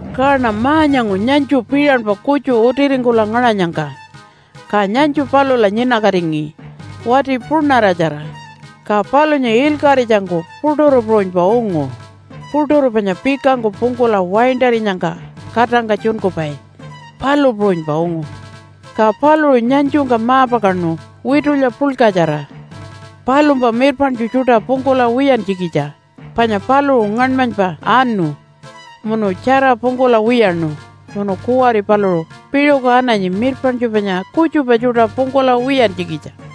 Kaṉa ma-nyangu nyanytju piṟanpa kutju utiringkula ngaṟanyangka. Ka nyanytju palula nyinakatingi wati punaṟatjara, ka palunya ilkaṟitjangku puṯuru puṟunypa ungu, puṯuru panya pikangku pungkula waintarinyangka katangka tjunkupai, palu puṟunypa ungu. Ka paluṟu nyanytjungka ma-pakaṉu witulya puḻkatjara palumpa mirpaṉtju tjuṯa pungkula wiyantjikitja, panya paluṟu ngaṉmanypa anu munu tjara pungkula wiyaṉu, munu kuwari paluṟu piṟuku ananyi mirpaṉtju panya kutjupa tjuṯa pungkula wiyantjikitja.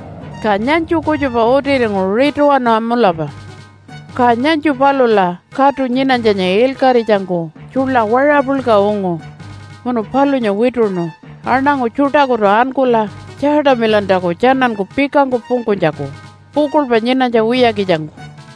Ka nyanytju kutjupa utiringu rituwana mulapa. Ka nyanytju palula katu nyinanytjanya ilkaṟitjangku tjuḻa waṟa puḻka ungu munu palunya wituṉu aṉangu tjuṯakutu ankula tjaatamilantjaku tjananku pikangku pungkunytjaku pukuḻpa nyinanytja wiyakitjangku.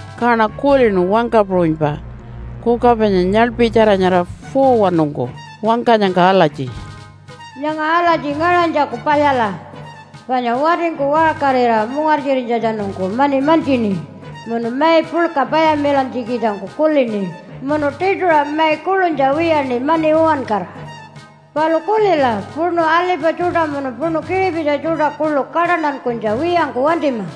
Kaṉa kulinu wangka puṟunypa kuka panya nyaḻpitjara nyara 4-wanungku wangkanyangka alatji, “Nyanga alatji ngaṟanytjaku palyala, panya watingku waṟkarira mungartjirinytjatjanungku mani mantjini munu mai puḻka payamilantjikitjangku kulini munu tiṯuṟa mai kuḻunytja wiyaṉi mani uwankara. Palu kulila, puṉu alipa tjuṯa munu puṉu kiṟipitji tjuṯa kuḻu kaṯantankunytja wiyangku wantima.”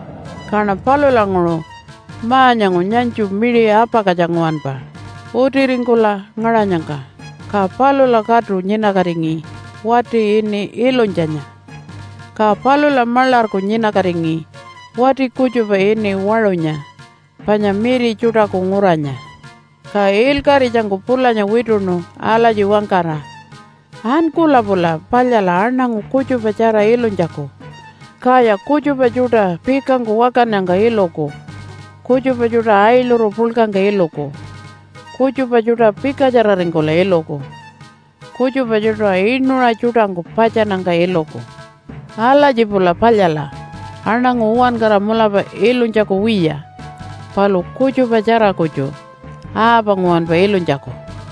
Kaṉa palulanguṟu ma-nyangu nyanytju miṟi apakatja nguwanpa utiringkula ngaṟanyangka, ka palula katu nyinakatingi wati ini Ilunytjanya, ka palula maḻarku nyinakatingi wati kutjupa ini Waṟunya panya Miri Tjuṯaku Nguranya. Ka ilkaṟitjangku pulanya wituṉu alatji wangkara, “Ankula pula palyala aṉangu kutjupatjara ilunytjaku, kaya kutjupa tjuṯa pikangku wakannyangka iluku, kutjupa tjuṯa ailuru puḻkangka iluku, kutjupa tjuṯa pikatjararingkula iluku, kutjupa tjuṯa inuṟa tjuṯangku patjannyangka iluku. Alatji pula palyala aṉangu uwankara mulapa ilunytjaku wiya, palu kutjupatjara kutju, aapa nguwanpa ilunytjaku.”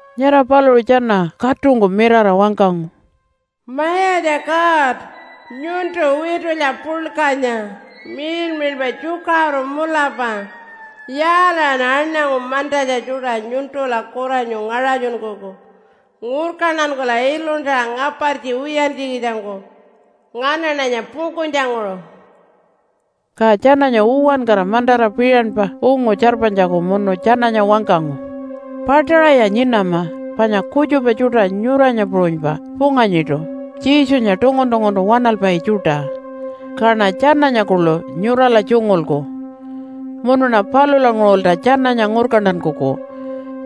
Nyara paluṟu tjana katungku mirara wangkangu, “Mayatja God nyuntu witulya puḻkanya, miḻmiḻpa tjukaṟuru mulapa. Yaalaṟan aṉangu mantatja tjuṯa nyuntula kuranyu ngaṟatjunkuku ngurkantankula iluntara ngapartji wiyantjikitjangku nganaṉanya pungkunytjanguṟu?” Ka tjananya uwankara mantara piṟanpa ungu tjarpanytjaku munu tjananya wangkangu, “Paṯaṟaya nyinama, panya kutjupa tjuṯa nyuranya puṟunypa punganyiṯu Jesunya tungun-tunguntu waṉalpai tjuṯa. Kaṉa tjananya kuḻu nyurala tjungulku. Munuṉa palulanguṟulta tjananya ngurkantankuku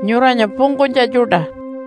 nyuranya pungkunytja tjuṯa.”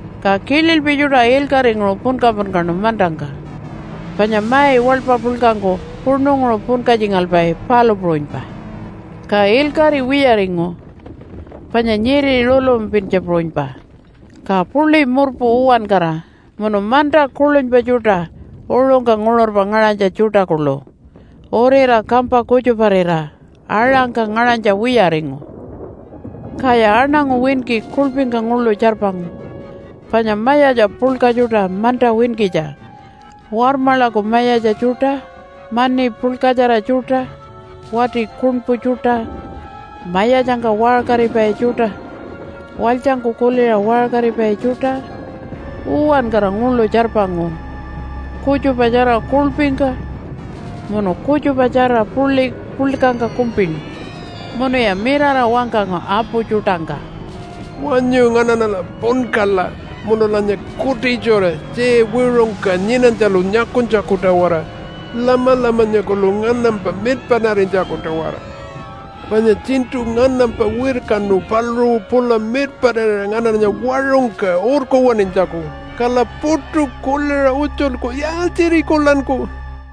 Ka kililpi tjuṯa ilkaṟinguṟu punka-punkaṉu mantangka, panya mai waḻpa puḻkangku puṉunguṟu punkatjingalpai, palu puṟunypa. Ka ilkaṟi wiyaringu panya nyiri rulumapintja puṟunypa, ka puḻi murpu uwankara munu manta kuḻunypa tjuṯa uṟungka nguṟurpa ngaṟanytja tjuṯa kuḻu urira kampa kutjuparira aṟangka ngaṟanytja wiyaringu. Kaya aṉangu winki kuḻpingka nguḻu tjarpangu. Panya mayatja puḻka tjuṯa manta winkitja, warmaḻaku mayatja tjuṯa, mani puḻkatjara tjuṯa, wati kuṉpu tjuṯa, mayatjangka waṟkaripai tjuṯa, walytjangku kuliṟa waṟkaripai tjuṯa, uwankara nguḻu tjarpangu, kutjupatjara kuḻpingka munu kutjupatjara puḻi puḻkangka kumpinu. Munuya mirara wangkangu apu tjuṯangka, “Wanyu nganaṉala punkala munulanya kutitjura tjiya wiṟungka nyinanytjalu nyakunytjaku-tawara, Lamalamanya kuḻu nganampa mirpaṉarinytjaku-tawara. Panya tjiṉṯu nganampa wirkanu paluṟu pula mirpaṉarira nganaṉanya waṟungka urkuwaṉinytjaku, kala puṯu kuliṟa utjulku, ‘Yaaltjirikulanku?’”